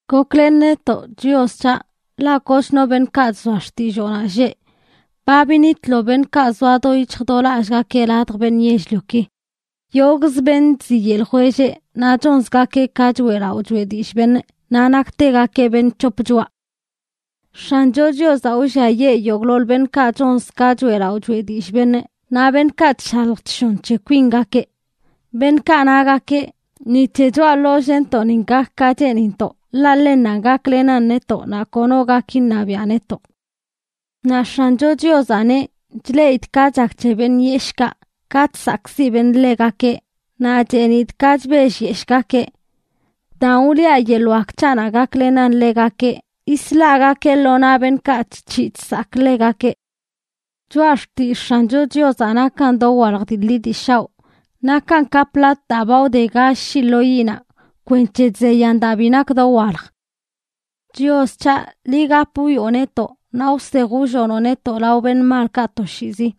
Goklen netoꞌ, Chios c̱haꞌ, ḻaꞌ kochno beṉꞌkaꞌ chzoa xtilloonaꞌ lleꞌ. Ba binitlo beṉꞌkaꞌ zoa do yic̱hj do lallꞌgakeꞌ ladj beṉꞌ yell-lioki. Yogꞌzə beṉꞌ chziyeꞌ ljwelleꞌ, naꞌ chonzgakeꞌ ka choꞌelaꞌo choꞌe dillꞌ beṉꞌ, naꞌ naktegakeꞌ beṉꞌ c̱hop choꞌa. X̱ancho Chiozaꞌ wlliayee yogꞌḻoḻ beṉꞌkaꞌ chonz ka choꞌelaꞌo choꞌe dillꞌ beṉꞌ naꞌ beṉꞌkaꞌ chshalj chshon c̱he kwingakeꞌ, beṉꞌkaꞌ nagakeꞌ: “Ni c̱he choꞌa ḻollꞌntoꞌnin gak ka cheenintoꞌ, ḻaꞌ ḻennanꞌ gaklenan netoꞌ naꞌ kono gak iṉabiaꞌ netoꞌ.” Naꞌ X̱ancho Chiozaꞌ neꞌ: “Chleꞌidꞌ ka chak c̱he beṉꞌ yeshꞌkaꞌ, ka chsakꞌziꞌ beṉꞌ ḻegakeꞌ, naꞌ chenidꞌ ka chbellyeshꞌgakeꞌ. Daan wliꞌa yeḻꞌ wak c̱haꞌnaꞌ gaklenꞌ ḻegakeꞌ, yislagakee lo naꞌ beṉꞌkaꞌ chc̱hiꞌ chsakꞌ ḻegakeꞌ.” Choꞌa xtillꞌ X̱ancho Chiozaꞌ nakan dowalj dii ḻi dii shaoꞌ. Nakan ka plat daa ba wde gall shii lo yiꞌnaꞌ kwenc̱he chzeyan daa bi nakə dowalj. Chios c̱haꞌ, liꞌ gap wwioꞌ netoꞌ naꞌ wsej wllonoꞌ netoꞌ lao beṉꞌ malkaꞌ toshiizi.